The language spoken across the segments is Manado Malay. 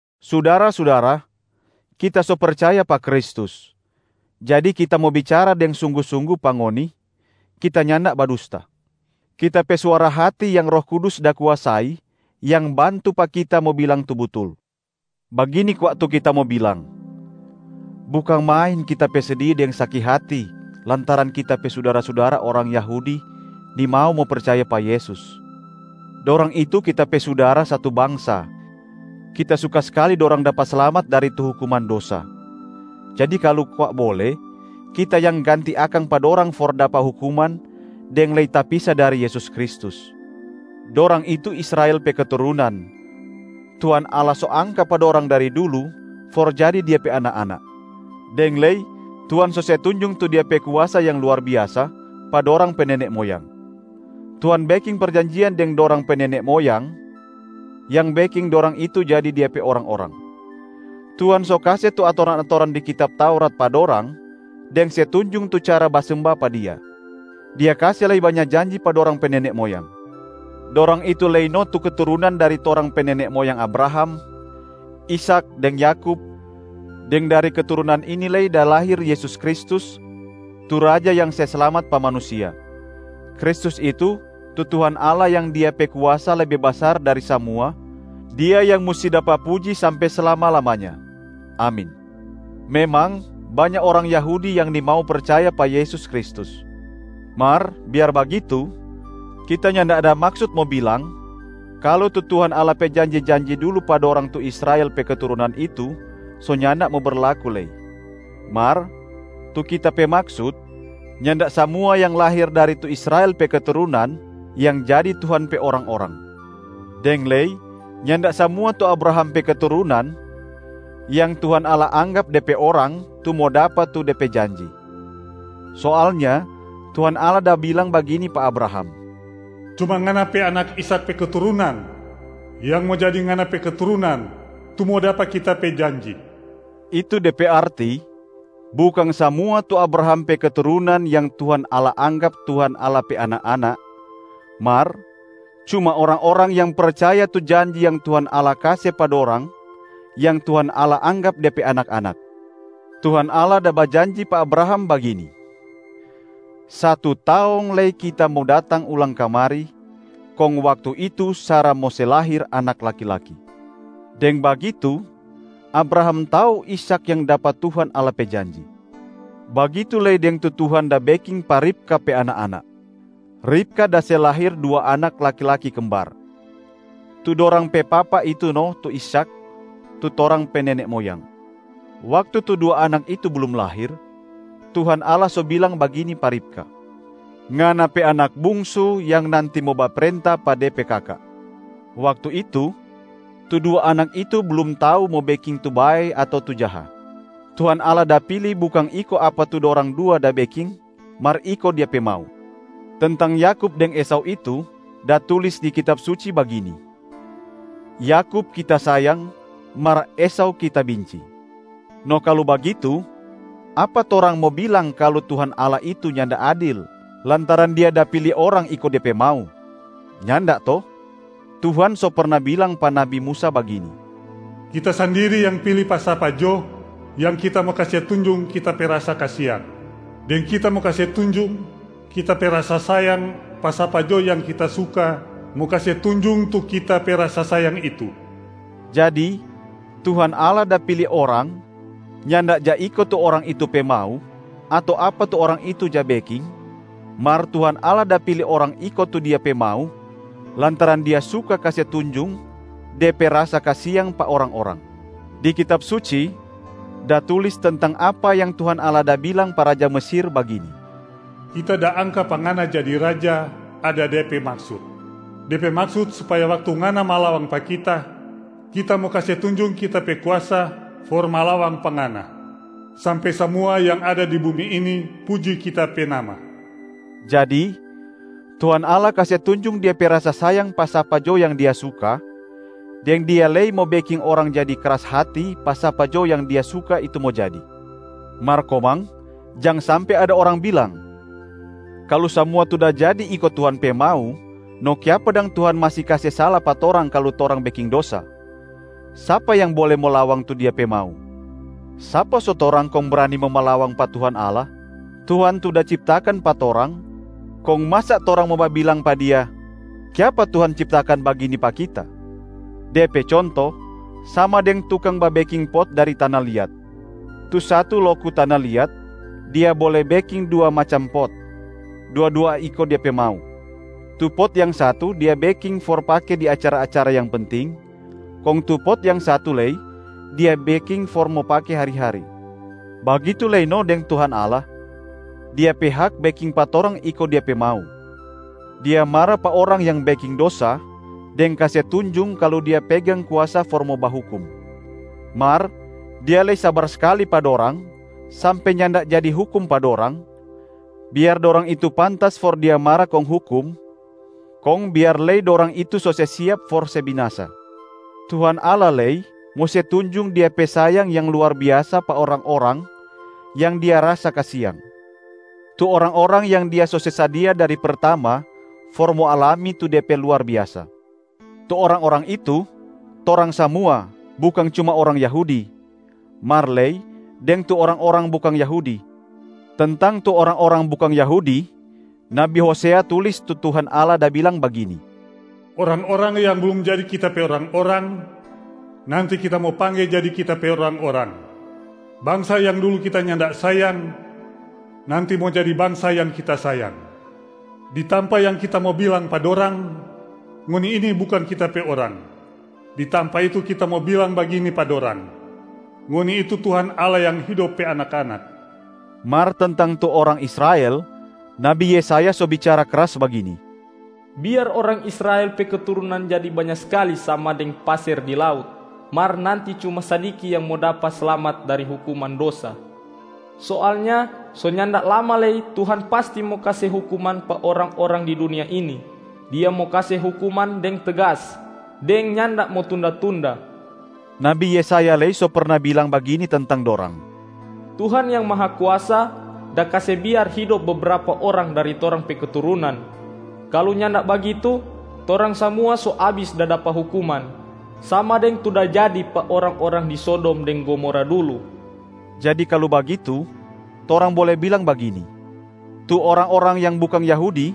Sudara-sudara, kita so percaya pa Kristus, jadi kita mo bicara deng sunggu-sunggu pa ngoni, kita nyanda badusta. Kita pe suara hati yang Roh Kudus da kuasai yang bantu pa kita mo bilang tu butul. Bagini kwa tu kita mo bilang: bukang main kita pe sedi deng saki hati lantaran kita pe sudara-sudara orang Yahudi nimau mo percaya pa Yesus. Dorang itu kita pe sudara satu bangsa, kita suka skali dorang dapa slamat dari tu hukuman dosa. Jadi kalu kwa bole, kita yang ganti akang pa dorang for dapa hukuman deng lei tapisa dari Yesus Kristus. Dorang itu Israel pe keturunan, Tuhan Allah so angka pa dorang dari dulu for jadi Dia pe anak-anak. Deng lei Tuhan so se tunjung tu Dia pe kuasa yang luar biasa pa dorang pe nene moyang. Tuhan beking perjanjian deng dorang pe nene moyang yang beking dorang itu jadi Dia pe orang-orang. Tuhan so kase tu atoran-atoran di kitab Taurat pa dorang deng se tunjung tu cara basemba pa Dia. Dia kase lei banya janji pa dorang pe nene moyang. Dorang itu lei no tu keturunan dari torang pe nene moyang Abraham, Ishak deng Yakub, deng dari keturunan ini lei da lahir Yesus Kristus tu Raja yang se slamat pa manusia. Kristus itu, tu Tuhan Allah yang Dia pe kuasa lebe basar dari samua, Dia yang musti dapa puji sampe slama-lamanya. Amin. Memang banya orang Yahudi yang nimau percaya pa Yesus Kristus, mar biar bagitu kita nyanda ada maksut mo bilang kalu tu Tuhan Allah pe janji-janji dulu pa dorang tu Israel pe keturunan itu so nyanda mo berlaku lei. Mar tu kita pe maksut nyanda samua yang lahir dari tu Israel pe keturunan yang jadi Tuhan pe orang-orang. Deng lei, nyanda samua tu Abraham pe keturunan yang Tuhan Allah anggap De pe orang tu mo dapa tu De pe janji. Soalnya Tuhan Allah da bilang bagini pa Abraham, “Cuma ngana pe anak Ishak pe keturunan yang mo jadi ngana pe keturunan tu mo dapa Kita pe janji.” Itu de pe arti, bukang samua tu Abraham pe keturunan yang Tuhan Allah anggap Tuhan Allah pe anak-anak, mar cuma orang-orang yang percaya tu janji yang Tuhan Allah kase pa dorang yang Tuhan Allah anggap De pe anak-anak. Tuhan Allah da bajanji pa Abraham bagini, “Satu taong lei Kita mo datang ulang kamari, kong waktu itu Sara mo se lahir anak laki-laki.” Deng bagitu, Abraham tau Ishak yang dapa Tuhan Allah pe janji. Bagitu lei deng tu Tuhan da beking pa Ribka pe anak-anak. Ribka da se lahir dua anak laki-laki kembar. Tu dorang pe papa itu no tu Ishak tu torang pe nene moyang. Waktu tu dua anak itu blum lahir, Tuhan Allah so bilang bagini pa Ribka, “Ngana pe anak bungsu yang nanti mo baprenta pa de pe kaka.” Waktu itu, tu dua anak itu blum tau mo beking tu bae ato tu jaha, Tuhan Allah da pili bukang iko apa tu dorang dua da beking mar iko Dia pe mau. Tentang Yakub deng Esau itu, da tulis di Kitab Suci bagini: “Yakub Kita sayang, mar Esau Kita binci”. No kalu bagitu apa torang mo bilang kalu Tuhan Allah itu nyanda adil lantaran Dia da pili orang iko De pe mau? Nyanda to. Tuhan so perna bilang pa Nabi Musa bagini: “Kita sandiri yang pili pa sapa jo yang Kita mo kase tunjung Kita pe rasa kasiang. Deng Kita mo kase tunjung Kita pe rasa sayang pa sapa jo yang Kita suka mo kase tunjung tu Kita pe rasa sayang itu.” Jadi Tuhan Allah da pili orang nyanda ja iko tu orang itu pe mau ato apa tu orang itu ja beking, mar Tuhan Allah da pili orang iko tu Dia pe mau lantaran Dia suka kase tunjung De pe rasa kasiang pa orang-orang. Di Kitab Suci da tulis tentang apa yang Tuhan Allah da bilang pa raja Mesir, bagini, “Kita da angka pa ngana jadi raja ada de pe maksut. De pe maksut supaya waktu ngana malawang pa Kita, Kita mo kase tunjung Kita pe kuasa for malawang pa ngana, sampe samua yang ada di bumi ini puji Kita pe nama.” Jadi, Tuhan Allah kase tunjung Dia pe rasa sayang pa sapa jo yang Dia suka, deng Dia lei mo beking orang jadi kras hati pa sapa jo yang Dia suka itu mo jadi. Mar komang jang sampe ada orang bilang, “Kalu samua tu da jadi iko Tuhan pe mau, no kiapa dang Tuhan masi kase sala pa torang kalu torang beking dosa? Sapa yang bole mo lawang tu Dia pe mau?” Sapa so torang kong brani mo malawang pa Tuhan Allah? Tuhan tu da ciptakan pa torang, kong masa torang mo babilang pa Dia, “Kiapa Tuhan ciptakan bagini pa kita?” De pe conto sama deng tukang babeking pot dari tana liat. Tu satu loku tana liat, dia bole beking dua macam pot, dua-dua iko dia pe mau. Tu pot yang satu dia beking for pake di acara-acara yang penting, kong tu pot yang satu lei dia beking for mo pake hari-hari. Bagitu lei no deng Tuhan Allah, Dia pe hak beking pa torang iko Dia pe mau. Dia mara pa orang yang beking dosa deng kase tunjung kalu Dia pegang kuasa for mo bahukum. Mar Dia lei sabar skali pa dorang sampe nyanda jadi hukum pa dorang, biar dorang itu pantas for Dia mara kong hukum, kong biar lei dorang itu so se siap for se binasa. Tuhan Allah lei mo se tunjung Dia pe sayang yang luar biasa pa orang-orang yang Dia rasa kasiang. Tu orang-orang yang Dia so se sadia dari pertama for mo alami tu De pe luar biasa. Tu orang-orang itu, torang samua bukang cuma orang Yahudi, mar lei deng tu orang-orang bukang Yahudi. Tentang tu orang-orang bukang Yahudi, nabi Hosea tulis tu Tuhan Allah da bilang bagini, “Orang-orang yang blum jadi Kita pe orang-orang, nanti Kita mo pangge jadi Kita pe orang-orang. Bangsa yang dulu Kita nyanda sayang, nanti mo jadi bangsa yang Kita sayang.” “Di tampa yang Kita mo bilang pa dorang, ‘Ngoni ini bukang Kita pe orang,’ Di tampa itu Kita mo bilang bagini pa dorang, ‘Ngoni itu Tuhan Allah yang hidop pe anak-anak.’” Mar tentang tu orang Israel, nabi Yesaya so bicara kras bagini, “Biar orang Israel pe keturunan jadi banya skali sama deng paser di laut, mar nanti cuma sadiki yang mo dapa slamat dari hukuman dosa. Soalnya so nyanda lama lei Tuhan pasti mo kase hukuman pa orang-orang di dunia ini. Dia mo kase hukuman deng tegas deng nyanda mo tunda-tunda.” Nabi Yesaya lei so perna bilang bagini tentang dorang, “Tuhan yang Mahakuasa da kase biar hidop bebrapa orang dari torang pe keturunan. Kalu nyanda bagitu, torang samua so abis da dapa hukuman, sama deng tu da jadi pa orang-orang di Sodom deng Gomora dulu.” Jadi kalu bagitu, torang bole bilang bagini, “Tu orang-orang yang bukang Yahudi,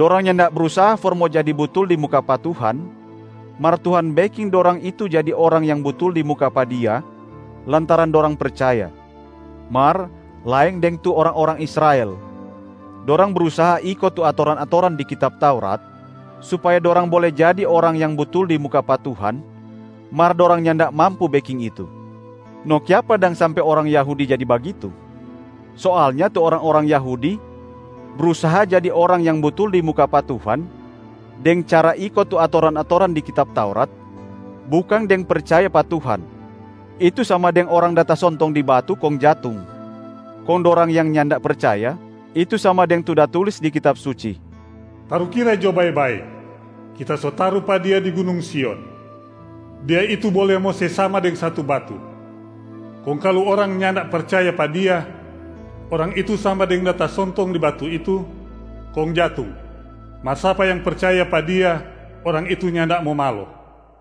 dorang nyanda brusaha for mo jadi butul di muka pa Tuhan, mar Tuhan beking dorang itu jadi orang yang butul di muka pa Dia lantaran dorang percaya. Mar laeng deng tu orang-orang Israel. Dorang brusaha iko tu atoran-atoran di Kitab Taurat supaya dorang bole jadi orang yang butul di muka pa Tuhan, mar dorang nyanda mampu beking itu.” No kiapa dang sampe orang Yahudi jadi bagitu? Soalnya tu orang-orang Yahudi brusaha jadi orang yang butul di muka pa Tuhan deng cara iko tu atoran-atoran di Kitab Taurat, bukang deng percaya pa Tuhan. Itu sama deng orang da tasontong di batu kong jatung. Kong dorang yang nyanda percaya, itu sama deng tu da tulis di Kitab Suci, “Tarukira jo bae-bae, Kita so taru pa Dia di gunung Sion. Dia itu bole mo se sama deng satu batu, kong kalu orang nyanda percaya pa Dia, orang itu sama deng da tasontong di batu itu kong jatung. Mar sapa yang percaya pa Dia, orang itu nyanda mo malo.”